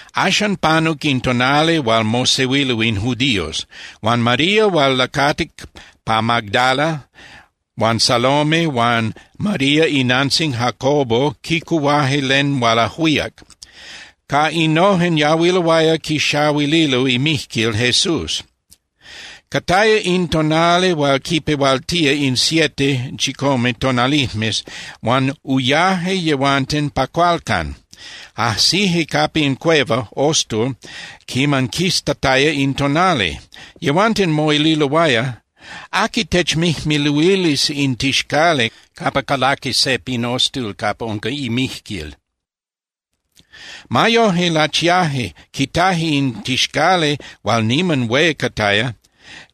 Axan panuc in tonali hual mosehuilo in judíos, huan María hual lacatic pa Magdala huan Salome huan María inantzin Jacobo quicuhuaje len hual ajuíac. Ca innojen yahuiloaya quixahuililo imijquil Jesús. Cataya in tonali hual quipehualtía in siete (chicome) tonalijmes huan uyaje yehuanten pa cualcan. Ajsije capa in cueva (ostul), quiman quistataya in tonali. Yehuanten moililoaya: —¿Aqui techmijmiluilis in tixcali capa calaqui se pin ostul capa unca imijquil? Ma yoje, lachiaje, quitaje in tixcali hual niman hué cataya,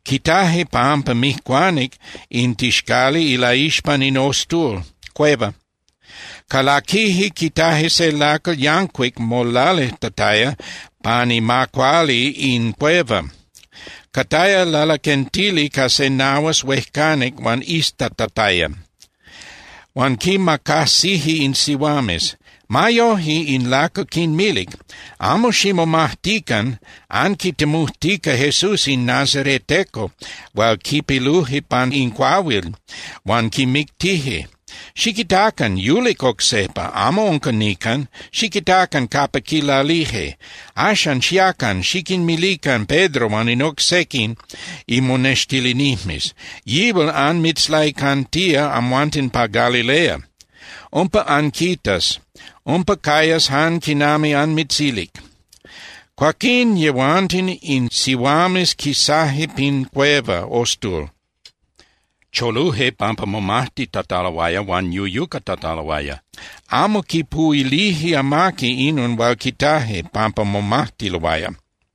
quitaje pampa mijcuanic in tixcali ilaixpan in ostul (cueva). Calaquije, quitaje se lacal yancuic molalijtataya pan ima cuali in cueva. Cataya lalaquentili ca se nahuas huejcanic hual iztatataya, huan quimacajsije in sihuames. Ma yoje, in lacal quinmilic: —Amo ximomajtican. Anquitemujtica Jesús in nazareteco hual quipiluje pan in cuahuil huan quimictije. Xiquitacan. Yulic oc sejpa, amo unca nican. Xiquitacan capa quilalije. Axan, xiacan, xiquinmilican Pedro huan in oc sequin imonextilinijmes: “Yihual anmitzlaicantía amhuanten pa Galilea. Umpa anquitas, umpa cayas jan quinami anmitzilic.” Cuaquín yehuanten in sihuames quisaje pin cueva (ostul), choluje pampa momajtitataloaya huan yuyucatataloaya. Amo quipuhuilije amaqui inon hual quitaje pampa momajtiloaya.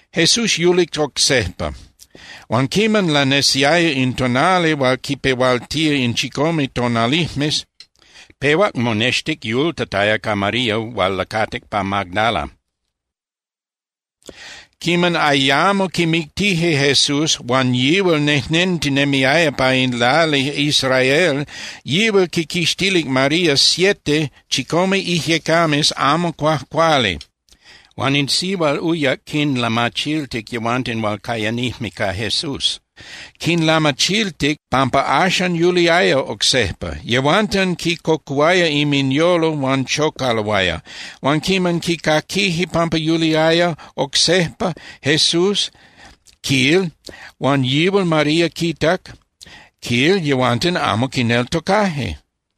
Jesús yulic oc sejpa. Huan quiman lanesiaya in tonali hual quipehualtía in chicome tonalijmes, pehuac monextic yultataya ca María hual lacatic pa Magdala. Quiman ayamo quimictije Jesús huan yihual nejnentinemiaya pa in lali Israel, yihual quiquixtilic María siete (chicome) ijyecames amo cuajcuali. Huan in sihual uyac quinlamachiltic yehuanten hual cayanijme ca Jesús, quinlamachiltic pampa axan yuliaya oc sejpa. Yehuanten quicocuhuaya inminyolo huan chocaloaya. Huan quiman quicaquije pampa yuliaya oc sejpa Jesús, quil, huan yihual María quitac, quil, yehuanten amo quineltocaje.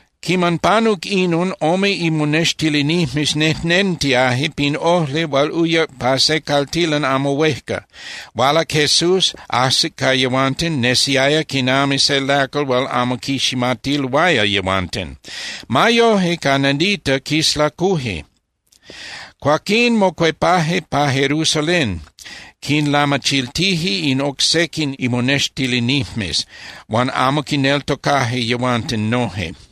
Quiman panuc inon, ome imonextilinijmes nejnentiaje pin ojli hual uyac pa se caltilan amo huejca. Hualac Jesús, ajsic ca yehuanten, nesiaya quinami se lacal hual amo quiximatiloaya yehuanten. Ma yoje, ca nadita quislacuje. Cuaquín mocuepaje pa Jerusalén, quinlamachiltije in oc sequin imonextilinijmes, huan amo quineltocaje yehuanten noje.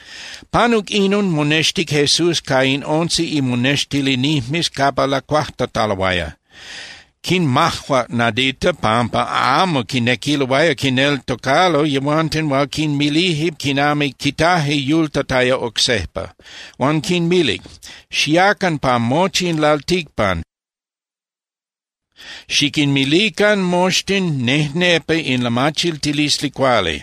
Panuc inon, monextic Jesús ca in once imonextilinijmes capa lacuajtataloaya. Quinmajuac nadita pampa amo quinequiloaya quinneltocalo yehuanten hual quinmilije quinami quitaje yultataya oc sejpa. Huan quinmilic: —Xiacan pa mochi in lalticpan, xiquinmilican moxtin nejnepa in lamachiltilisli cuali.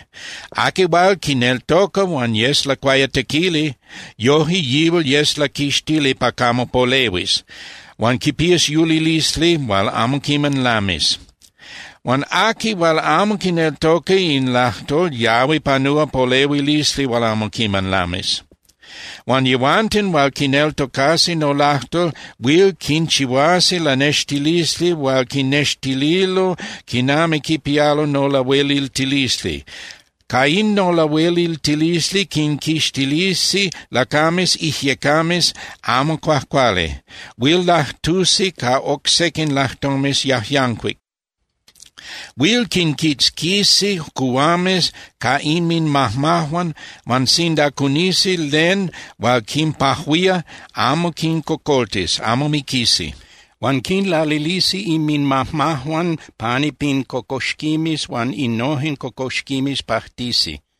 Aqui hual quineltoca huan yes lacuayatequili, yoje yihual yes laquixtili pa camo polehuis huan quipías yulilisli hual amo quiman lamis. Huan aqui hual amo quineltocas in lajtol yahui panúa polehuilisli hual amo quiman lamis. Huan yehuanten hual quineltocasi nolajtol huil quinchihuasi lanextilisli hual quinnextililo quinami quipialo nolahueliltilisli. Ca in nolahueliltilisli quinquixtilisi lacames ijyecames amo cuajcuali. Huil lajtusi ca oc sequin lajtomes yajyancuic. Huil quinquitzquisi cuhuames ca inminmajmajuan huan sinda cunisi len hual quinpajuía, amo quincocoltis, amo miquisi. Huan quinlalilisi inminmajmajuan pani pin cocoxquimes huan innojen cocoxquimes pajtisi.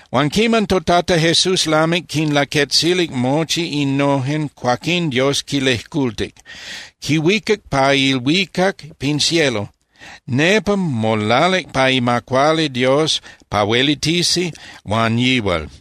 Huan quiman toTata Jesús lamic quinlaquetzilic mochi innojen, cuaquín Dios quilejcultic. Quihuicac pa ilhuicac (pin cielo), nepa molalic pa ima cuali Dios pa huelitisi huan yihual.